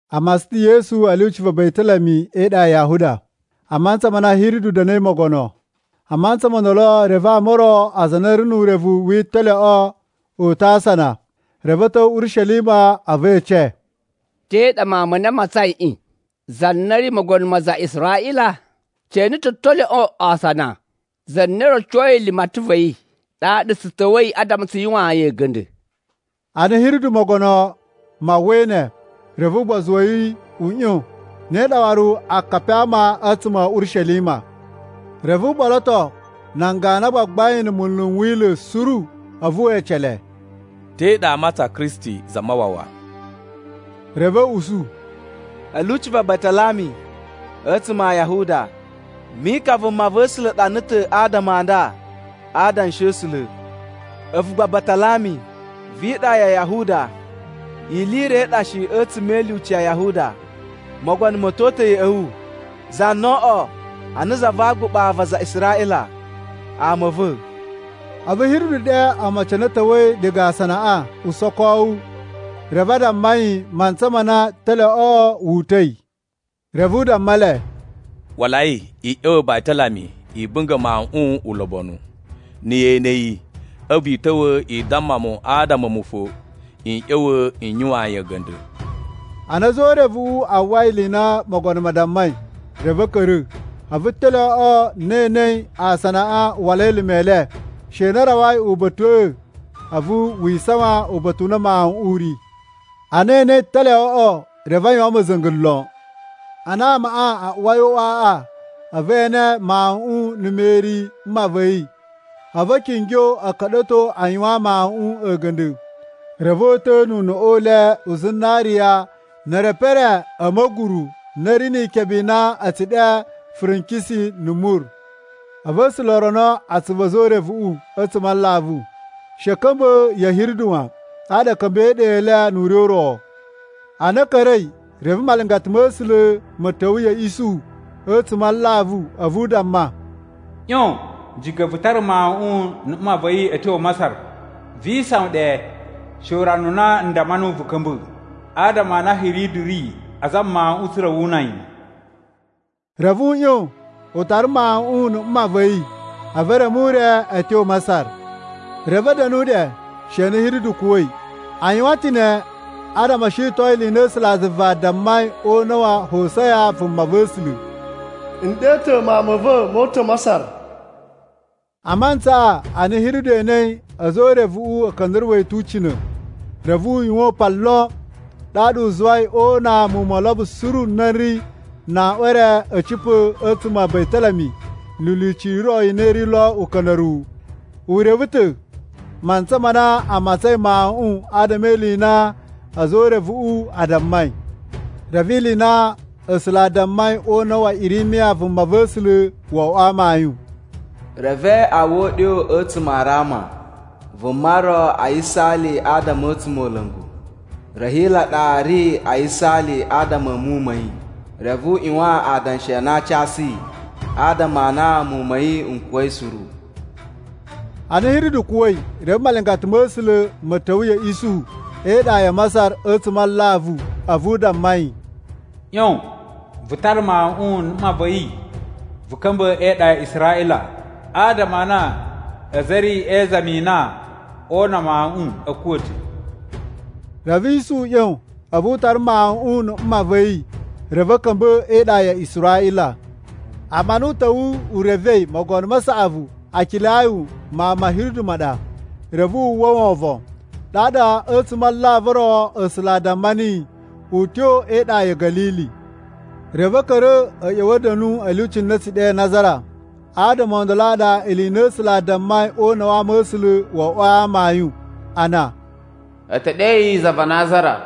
A matsan ta̱ Yesu a̱ lyuci va Batalami e iɗa ya Yahuda, a mantsa ma na Hiridu da̱na̱i mogono. A mantsa mo ndolo, reve ama o ro aza a na a̱ ri nu urevu wi italyoꞌo o uta̱ asana reve a̱ ta̱wa̱ Urishelima. A̱vu e ece, “Te ɗa mawun ma na a matsaiꞌin, za na ri mogono ma aza a Israꞌila? Tse ene ta̱ talyoꞌo asana za na rocoi limatan va̱ yi ɗaɗa tsu ta̱wa̱i adama tsu yuwaan yi a̱ga̱nda̱.” Ana Hiridu Mogono ma uwwai ne, reve ugbozu wa̱ yi u ꞌyon, ne ɗa waru akapi a ama a̱tsuma̱ a̱ Urishelima. Reve u ɓoloto nan ganu a gbagbain na̱ munlu n Wila̱ suru, a̱vu we ece le, “Te ɗa aa matsan Kristi Zamawawa?” Reve a̱ usu, “A̱ lyuci va Batalami a̱tsuma̱ a Yahuda. Mika vumava̱sula̱ ɗana ta̱ adama a nda a Adanshi a̱ A̱sula̱: ‘A̱vu gba Batalami, vi iɗa ya Yahuda, ili i ro i ɗa shi a̱tsuma̱ e ilyuci ya Yahuda. Mogono ma̱ to uta̱ ya̱ꞌa̱ wu. Za na oo oꞌwo ana za va aguɓa va aza a Israꞌila, ama a̱ va̱.’” A̱vu Hiridu ɗe omocin a na a̱ ta̱wa̱i diga asanaꞌa usokowu, reve a damma yi mantsa ma na talyoꞌoꞌo vu uta̱i. Reve u damma le, “Walai i ꞌya̱wa̱ Batalami i bunga̱ mawuꞌun ulobonu. Na̱ ye ene yi, a̱vu i ta̱wa̱ i damma mu adama a̱mu fo n ꞌya̱wa̱ n yuwaan yi a̱ga̱nda̱!” Ana a̱za̱ o urevuꞌu a uwwai ili i na mogono ma dammai, reve a̱ ka̱ra̱. A̱vu talyoꞌo na e enei a asanaꞌa u wala elime e le, she na u rawai uba̱ta̱ꞌa̱, a̱vu wi isawan uba̱ta̱ u na mawuꞌun u ri. Ana e enei talyoꞌoꞌo, reve a yuwan ma̱za̱nga̱ lon! Ana amaꞌa a uwai o uꞌwaꞌa, a̱vu e ene mawuꞌun na̱ Meri mma va̱ yi, a̱vu a̱ kingyo a̱ ka̱ɗa̱to a yuwaan mawuꞌun a̱ga̱nda̱. Reve o uta̱a̱ nu uneꞌe u le u zinariya, ne erepu e re a̱ ma̱guru na ri ni ikebe na a̱ tsu ɗe furenkisen na̱ mur. A̱vu A̱sula̱ o rono atsuvu a̱za̱ o urevuꞌu a̱tsuma̱ a alavu, she a̱ ka̱mba̱ ya̱ Hiridu wan, ɗaɗa a̱ ka̱mba̱i e iɗa i le nu ure u ro. Ana a̱ ka̱ra̱i, reve malingata ma̱ A̱sula̱ ma̱ ta̱wa̱ ya̱ Isuhu a̱tsuma̱ a alavu, a̱vu u damma, “ꞌYon! Jika̱ vu tara mawuꞌun na̱ mma va̱ yi a̱ tyo Masar! Vi isawan ɗe she urana u na n damma nuwu vu ka̱mba̱, adama a na Hiridu ri a zama mawuꞌun tsa̱ra̱ wu una yi.” Reve u ꞌyon, u tara mawuꞌun na̱ mma va̱ yi, a̱vu u reme ure na ayin a̱ tyo Masar. Reve a̱ da̱nu ɗe she na Hiridu kuwa̱i. A yuwan ta̱ ne adama o shiton ili i na A̱sulazuva a dammai o una̱ wa Hosiya vumava̱sula̱: “N ɗe ta̱ mawun ma̱ va̱ mo uta̱ Masar.” A mantsaꞌa ana Hiridu enei a̱za̱ o urevuꞌu a̱ ka̱nda̱ruwa̱ yi tu ucina̱, reve u yuwan upan lon. Ɗaɗa u zuwai o una muwun mo olobo suru n na n ri na aꞌwan e re a̱ cipa̱ a̱tsuma̱ a Batalami ni ilyuci i ro i na i ri lo uka̱nda̱ruwu. U reve ta̱ mantsa ma na a matsain mawuꞌun adama e ili i na a̱za̱ o urevuꞌu a dammai. Reve ili i na A̱sula̱ a dammai o una̱ wa Irimiya vumava̱sula̱ wo oꞌwo amayun: “Reve a uwwa uɗyo a̱tsuma̱ a Rama, vuma ro a yisaali a adama a̱ a̱tsumola̱ngu. Rahila ɗa ri a yisaali adama a̱ muwun ma̱ yi, reve u ꞌyuwan adanshi a na aa casu yi, adama a na muwun ma̱ yi n kuwa̱i suru.” Ana Hiridu kuwa̱i, reve malingata ma̱ A̱sula̱ ma̱ ta̱wa̱ ya̱ Isuhu e iɗa ya Masar a̱tsuma̱ a alavu. A̱vu u damma yi, “ꞌYon, vu tara mawuꞌun na̱ mma va̱ yi vu ka̱mba̱ e iɗa ya Israꞌila, adama a na aza a̱ ri e izami i na oo una mawuꞌun a̱ kuwa̱ ta̱.” Reve Isuhu ꞌyon, a̱vu u tara mawuꞌun na̱ mma va̱ yi, reve a̱ ka̱mba̱ e iɗa ya Israꞌila. Amma ana u ta̱wa̱ u revei mogono ma saꞌavu Akilayu mawun ma̱ Hiridu ma ɗa, reve wu uwwa wovon. Ɗaɗa a̱tsuma̱ a alavu o ro, A̱sula̱ a damma niyi u tyo e iɗa ya̱ Ga̱lili. Reve a̱ ka̱ra̱ a̱ ꞌya̱wa̱ a̱ da̱nu a̱ lyuci na a̱ tsu ɗe Nazara. Adama o ndolo a ɗa ili i na A̱sula̱ a dammai o una̱ wa ama̱sula̱ wo oꞌwoi amayun, a na: “E te ɗe yi za va Nazara.”